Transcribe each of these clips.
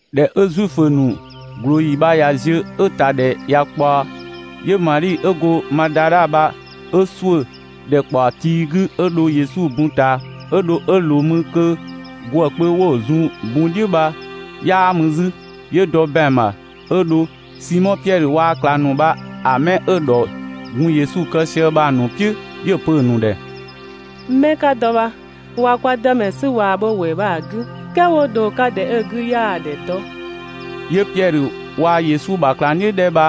꞊Dhɛ 'ö Zuifö ‑nu ꞊glooyi bha ꞊ya ziö 'ö‑ ‑ta ‑dhɛ ꞊ya ꞊kpaɔ, 'yö Madhi 'ö go Madadha bha 'ö ‑suʋ̈ ‑dhɛkpaɔ tii 'gü 'yö dho Yesu bun ꞊taa. 'Ö dho 'ö ꞊loo mü kö ‑gwë kpö 'wo‑ zun‑ bun "dhiʋ̈ bha 'yaa mü 'zü. 'Yö dɔ ‑bɛang ‑bha 'ö dho Simɔ Piɛdhö waa‑ ꞊klang ‑nu bha‑ mɛ 'dhɛ 'ö‑ ‑dhɔ gun Yesu kë sië bha‑ ‑nu "piʋ̈, 'yö‑ pö‑ ‑nu ‑dhɛ: «'Mɛ 'ka dɔ bha, ꞊wa kwa Dëmɛ 'sü ꞊waa‑ bho‑ ‑wɛɛ bha‑ 'gü "kɛɛ 'wo dho‑ 'ka ‑dhɛ 'ö‑ 'gü 'yaa‑ ‑dhɛ dɔ.» 'Yö Piɛdhö waa‑ Yesu ‑bha ꞊klangdhiʋ̈ 'dhɛ bha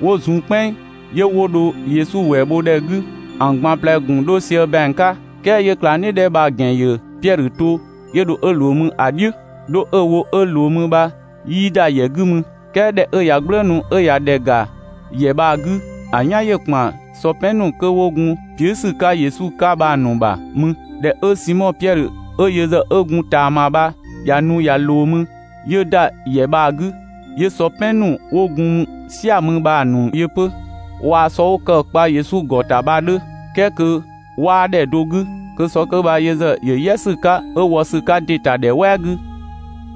'wo zun "kpɛnng, 'yö 'wo dho Yesu ‑wɛɛ bho ‑dhɛ 'gü. ‑An ꞊gban ꞊plɛ‑ ‑gun 'dho sië ‑bɛang 'ka "kɛɛ 'yö‑ ꞊klangdhiʋ̈ 'dhɛ bha‑ ‑gɛn ‑yö Piɛdhö to, 'yö dho 'ö ꞊loo mü ‑a "dhiʋ̈. 'Dho 'ö‑ wo 'ö ꞊loo mü bha 'yii ‑da ‑yɛ 'gü mü, "kɛɛ ꞊dhɛ 'ö ꞊ya "gblëënu, 'ö ꞊ya ‑dhɛ ‑ga ‑yɛ bha‑ 'gü, ‑a "yan ‑yö ‑kpan sɔ "pɛn ‑nu kö 'wo gun piʋ̈‑ ‑sü 'ka Yesu 'ka bha‑ ‑nu ‑bha mü. ꞊Dhɛ 'ö Simɔ Piɛdhö 'ö yö ‑zë 'ö gun ꞊taama bha ꞊ya nu ꞊ya ꞊loo mü, 'yö ‑da ‑yɛ bha‑ 'gü, 'yö sɔ "pɛn ‑nu 'wo gun "sia‑ mü bha‑ ‑nu yö 'pö waa‑ sɔ 'wo kë‑ kpa Yesu ‑gɔ ‑ta bha‑ 'dhö "kɛɛ kö 'waa ‑dhɛ do 'gü, kö sɔ 'kö bha yö ‑zë yö "yɛ ‑sü 'ka 'ö wɔ ‑sü 'ka ‑dɩ ‑ta ‑dhɛ "wɛɛ 'gü.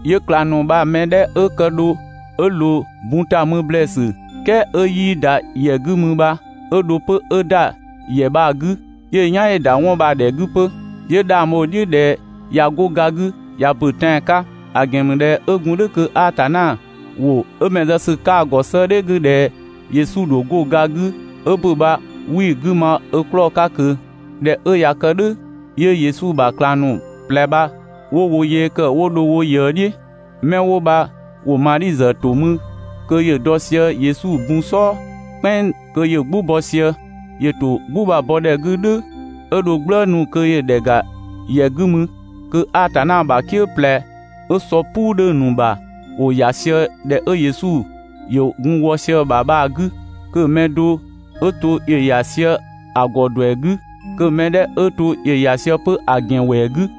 'Yö ꞊klang ‑nu bha‑ mɛ 'dhɛ 'ö kë dho 'ö ꞊loo bun ‑ta mü ‑blɛɛsü "kɛɛ 'ö 'yii ‑da ‑yɛ 'gü mü bha 'ö dho 'pö 'ö ‑da ‑yɛ bha‑ 'gü, 'yö‑ "yan ‑yö ‑da 'wɔn bha‑ ‑dhɛ 'gü 'pö, 'yö 'dhang bho‑ "dhiʋ̈ ꞊dhɛ ꞊ya 'go ga 'gü ꞊ya ‑bö tɛan‑ 'ka. ‑A ‑gɛn ‑mü ꞊dhɛ 'ö gun "dhʋ̈ kö Atanna ‑wʋ 'ö ‑bɛn zë ‑sü 'ka‑ ‑gɔ 'sëëdhɛ 'gü ꞊dhɛ Yesu ‑dho 'go ga 'gü 'ö ‑bö bha 'wii‑ 'gü ma ö 'klɔɔ‑ 'ka ꞊kö. ꞊Dhɛ 'ö ꞊ya kë "dhʋ̈, 'yö Yesu ‑bha ꞊klang ‑nu ꞊plɛ bha 'wo wo yee ‑kë 'wo dho wo ꞊yëë "dhiʋ̈. 'Mɛ 'wo bha ‑wo Madhi ‑zë ‑to mü kö ‑yö dɔ sië Yesu bun "sɔɔ "kpɛnng kö ‑yö "gbʋ bɔ sië. ‑Yö ‑to "gbʋ bha‑ bɔ ꞊dhɛ 'gü "dhʋ̈, 'ö dho "gblëënu kö ‑yö ‑dhɛ ‑ga ‑yɛ 'gü mü kö Atanna ‑bha "kië ꞊plɛ 'ö sɔ "puu 'dhö‑ ‑nu ‑bha ‑wo ‑ya sië ‑dhɛ 'ö Yesu ‑yö gun wɔ sië‑ ‑bha bha‑ 'gü, kö‑ mɛ do ‑yö ‑ya sië‑ ‑gɔ ‑duɛ 'gü, kö‑ ‑mɛ 'dhɛ 'ö to ‑yö ‑ya sië 'pö‑ ‑gɛn ‑wɛɛ 'gü.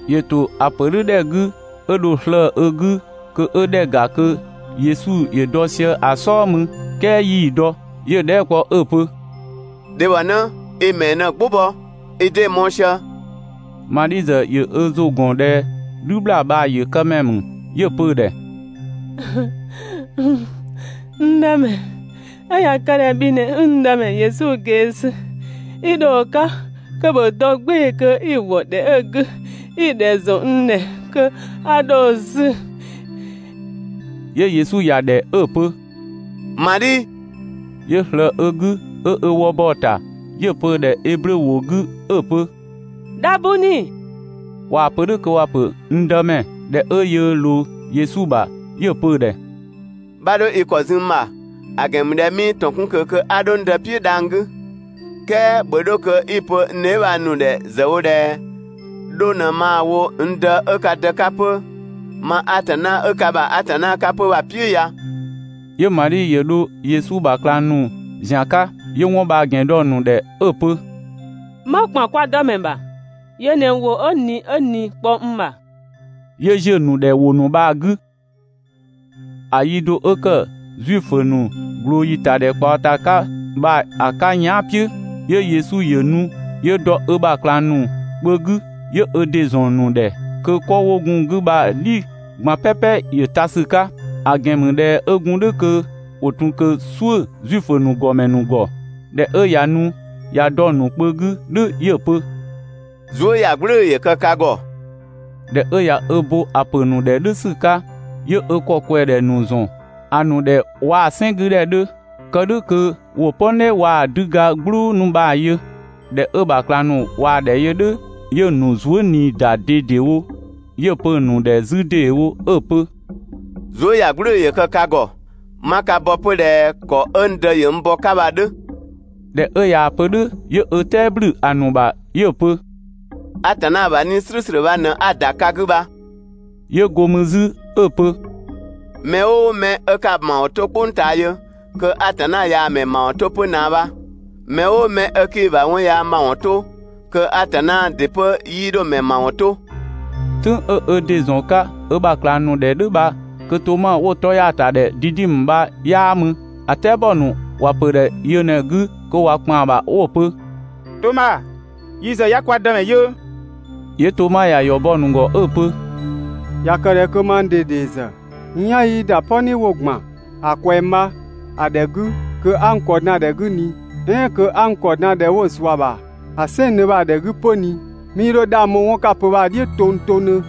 ‑Yö ‑to ‑a ‑pö "dhʋ̈ ‑dhɛ 'gü 'ö dho slëë‑ ö 'gü kö 'ö ‑dhɛ ‑ga kö Yesu ‑yö dɔ sië‑ "sɔɔ mü, "kɛɛ 'yii‑ dɔ. 'Yö‑ dhɛɛ" kpɔ 'ö‑ pö: «Dhebhɔnë, i‑ ‑mɛɛ ꞊në‑ "gbʋ bɔ? i 'dee‑ mɔɔ‑ sië?» Madhi ‑zë ‑yö ö ‑zʋ ‑gɔn ꞊dhɛ "dhü ‑bhlaa bha‑ yëkëmɛ ‑mü. 'Yö‑ pö‑ ‑dhɛ: «N Dëmɛ, 'ö ꞊ya kë ꞊dhɛ bhi ꞊në 'i n Dëmɛ Yesu ꞊gee sü 'i dho‑ 'ka kö ‑bhö dɔ "gbɩɩ‑ kö 'i‑ ‑wɔ ‑dhɛ 'ö‑ 'gü 'i‑ ‑dhɛ ‑zɔn n ‑dhɛ kö 'a 'dho‑ 'sü.» 'Yö Yesu ‑ya ‑dhɛ 'ö‑ pö: «Madhi!» 'Yö ꞊slëë ö 'gü 'ö ö wë bɔ‑ ‑ta, 'yö‑ pö‑ ‑dhɛ Eblö ‑wʋ 'gü 'ö‑ pö: «Dhabuni!» (꞊Waa‑ pö "dhʋ̈ kö ‑wa ‑pö «n Dëmɛ».) (꞊Dhɛ 'ö yöö ꞊loo Yesu ‑bha,) 'yö‑ pö‑ ‑dhɛ: «'Bha 'dho i ‑kɔ zun n ‑bha, ‑a ‑gɛn ‑mü ꞊dhɛ 'mii ‑tɔn 'kun ꞊kö kö 'a 'dho n Dë "piʋ̈ dhang‑ 'gü. "Kɛɛ ‑bhö 'dho kö 'i‑ pö n dheebhang ‑nu ‑dhɛ ‑zë wo ꞊dhɛ 'dho ꞊në maa‑ wo n Dë 'ö ka Dë 'ka 'pö, ma Atanna 'ö ka ‑bha Atanna 'ka 'pö bha‑ "piʋ̈ ya.» 'Yö Madhi ‑yö dho Yesu ‑bha ꞊klang ‑nu ‑zian 'ka, 'yö 'wɔn bha‑ ‑gɛn dɔ‑ ‑nu ‑dhɛ 'ö‑ pö: «'Ma ‑kpan kwa Dëmɛ ‑bha. Yö ꞊në ‑wʋ 'ö ꞊ni 'ö ꞊ni‑ kpɔ n ‑bha. 'Yö ‑ziö ‑nu ‑dhɛ ‑wʋ ‑nu bha‑ 'gü. ‑A yi do 'ö ‑kë Zuifö ‑nu ꞊glooyi ‑tadhɛkpaɔ ‑ta 'ka bha‑ 'ka yɛan" "piʋ̈, 'yö Yesu ‑yö nu 'yö dɔ ö ‑bha ꞊klang ‑nu kpö 'gü 'yö ö ‑dɩ ‑zɔn ‑nu ‑dhɛ kö 'kɔ 'wo gun‑ 'gü bha‑ "dhi ꞊gban "pɛpɛ ‑yö ta ‑sü 'ka, ‑a ‑gɛn ‑mü ꞊dhɛ 'ö gun "dhʋ̈ kö ‑wo ‑tun ꞊kö "suʋ̈ Zuifö ‑nu ‑gɔmɛ ‑nu ‑gɔ. ꞊Dhɛ 'ö ꞊ya nu ꞊ya dɔ‑ ‑nu kpö 'gü "dhʋ̈ 'yö‑ pö: «Zuëyagblʋ̈ʋ̈‑ ‑yö kë ka ‑gɔ!» ꞊Dhɛ 'ö ꞊ya ö bo‑ pö‑ ‑nu ‑dhɛ "dhʋ̈ ‑sü 'ka, 'yö ö ‑kɔ ꞊kwɛng ‑dhɛ ‑nu ‑zɔn ‑a ‑nu ‑dhɛ waa‑ "sɛn 'gü ‑dhɛ 'dhö, (kë "dhʋ̈ kö ‑wo "pɔni waa‑ 'düga "gblʋʋ ‑nu bha‑ yö). ꞊Dhɛ 'ö‑ ‑bha ꞊klang ‑nu ꞊waa‑ ‑dhɛ yö "dhʋ̈, 'yö‑ ‑nu zuë" ꞊nii ‑da ꞊dedewo. 'Yö‑ pö‑ ‑nu ‑dhɛ 'zü ‑deewo 'ö‑ pö: «Zuëyagblʋ̈ʋ̈‑ ‑yö kë ka ‑gɔ! 'Ma ka bɔ 'pö ꞊dhɛ ‑kɔ 'ö n Dë ‑yö n bɔ‑ 'ka bha‑ 'dhö. ꞊Dhɛ 'ö ꞊yaa‑ pö "dhʋ̈ 'yö ö "tɛɛ ‑blü ‑a ‑nu ‑bha 'yö‑ pö: «Atanna ‑bha 'Nii‑ "slʋ̈ʋ̈slʋ̈ bha ꞊në 'a‑ ‑da ka 'gü bha.» 'Yö 'go mü 'zü 'ö‑ pö: «Mɛ "ʋʋ mɛ 'ö 'ka‑ ‑mawɔn 'to "kpʋng ꞊taa yö, kö Atanna ꞊yaa‑ mɛ ‑mawɔn 'to 'pö ꞊naa bha. Mɛ "ʋʋ mɛ 'ö 'kii‑ ‑bha 'wɔn yaa ‑mawɔn 'to, kö Atanna ‑dɩ 'pö 'yii 'dho‑ ‑mɛ ‑mawɔn 'to. "Tʋ̈ng 'ö ö ‑dɩ ‑zɔn 'ka ö ‑bha ꞊klang ‑nu ‑dhɛ "dhʋ̈ bha kö Toma 'wo‑ 'tɔ ‑ya ‑ta ‑dhɛ Didimö bha 'yaa mü. ‑A "tɛabɔ ‑nu ‑wa pö‑ ‑dhɛ yö ꞊në‑ 'gü kö ꞊wa ‑kpan ‑bha 'wo‑ pö: «Toma, yi ‑zë 'ya kwa Dëmɛ yö.» 'Yö Toma ‑ya ‑yɔ bɔ‑ ‑nu ‑gɔ 'ö‑ pö: «꞊Ya kë ꞊dhɛ kö mang ꞊dede ‑zë n "yan 'yii ‑da "pɔni 'wo‑ ‑gban ‑a ꞊kwɛng bha‑ ‑dhɛ 'gü, kö 'a n ‑kɔ dan ‑dhɛ 'gü ꞊ni, "ɛɛn kö 'a n ‑kɔ dan ‑dhɛ 'wo zua‑ ‑bha ‑a "sɛnngdhö bha‑ ‑dhɛ 'gü 'pö ꞊ni, 'mii 'dho 'dhang bho 'wɔn 'ka‑ pö bha‑ "dhiʋ̈ tongtongdhö.»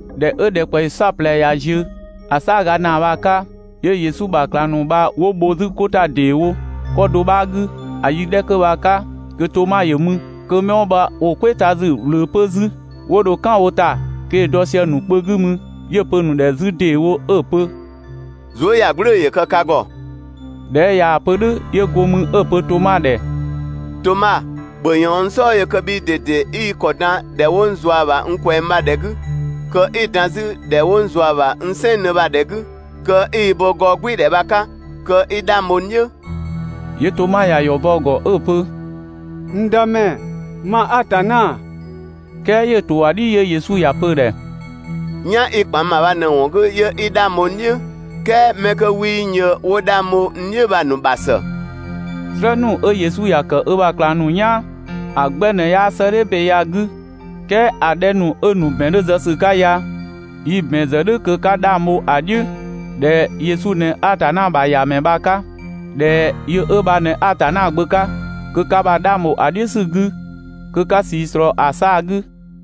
꞊Dhɛ 'ö ‑dhɛkpaɔyi "saɔplɛ ꞊ya ziö, ‑a "saaga ‑naa bha‑ 'ka, 'yö Yesu ‑bha ꞊klang ‑nu bha 'wo bho 'zü 'ko ‑ta ‑deewo 'kɔ do bha‑ 'gü. ‑A yi 'dhɛ kö bha‑ 'ka kö Toma ‑yö mü. Kö 'mɛ 'wo bha ‑wo "kwɛɛ ta ‑sü ꞊wlöö 'pö 'zü. 'Wo dho "kan wo ‑ta kö ‑yö dɔ sië‑ ‑nu kpö 'gü mü. 'Yö‑ pö‑ ‑nu ‑dhɛ 'zü ‑deewo 'ö‑ pö: «Zuëyagblʋ̈ʋ̈‑ ‑yö kë ka ‑gɔ!» ꞊Dhɛ 'ö ꞊yaa‑ pö "dhʋ̈ 'yö go mü 'ö‑ pö Toma ‑dhɛ: «Toma, ‑bhö ꞊yɔɔn n "sɔɔ yö kö bhii ꞊dede 'i i ‑kɔ dan ‑dhɛ 'wo n zua‑ ‑bha n ꞊kwɛng bha‑ ‑dhɛ 'gü, kö 'i‑ dan 'zü ‑dhɛ 'wo n zua‑ ‑bha n "sɛnngdhö bha‑ ‑dhɛ 'gü kö 'i i bo gɔɔgbɩɩdhɛ bha‑ 'ka kö 'i 'dhang bho n "dhiʋ̈.» 'Yö Toma ‑ya ‑yɔ bɔ‑ ‑gɔ 'ö‑ pö: «N Dëmɛ, ma Atanna!» "Kɛɛ ‑yö ‑to ‑a "dhi, 'yö Yesu ‑ya pö‑ ‑dhɛ: «"Yan 'i‑ ‑kpan n ‑bha bha ꞊në‑ ‑wɔn 'gü 'yö 'i 'dhang bho n "dhiʋ̈, "kɛɛ 'mɛ 'kö 'wii n yö 'wo 'dhang bho n "dhiʋ̈ bha‑ ‑nu ‑bha ‑së.» "Slë ‑nu 'ö Yesu ‑ya ‑kë ö ‑bha ꞊klang ‑nu "yaan ‑a 'gbɛ ꞊në 'yaa 'sëëdhɛ ‑be ya‑ 'gü. "Kɛɛ ‑a 'dhɛ ‑nu 'ö‑ ‑nu ‑bɛn 'dhö zë ‑sü 'ka ya yi‑ ‑bɛn zë "dhʋ̈ kö 'ka 'dhang bho‑ "dhiʋ̈ ꞊dhɛ Yesu ꞊në Atanna ‑bha ‑Yamɛ bha‑ 'ka, ꞊dhɛ yö 'ö bha ꞊në Atanna Gbö 'ka, kö ka ‑bha 'dhang ‑bho ‑a "dhiʋ̈ ‑sü 'gü, kö 'ka ꞊sii ꞊slɔɔ ‑a 'saa‑ 'gü.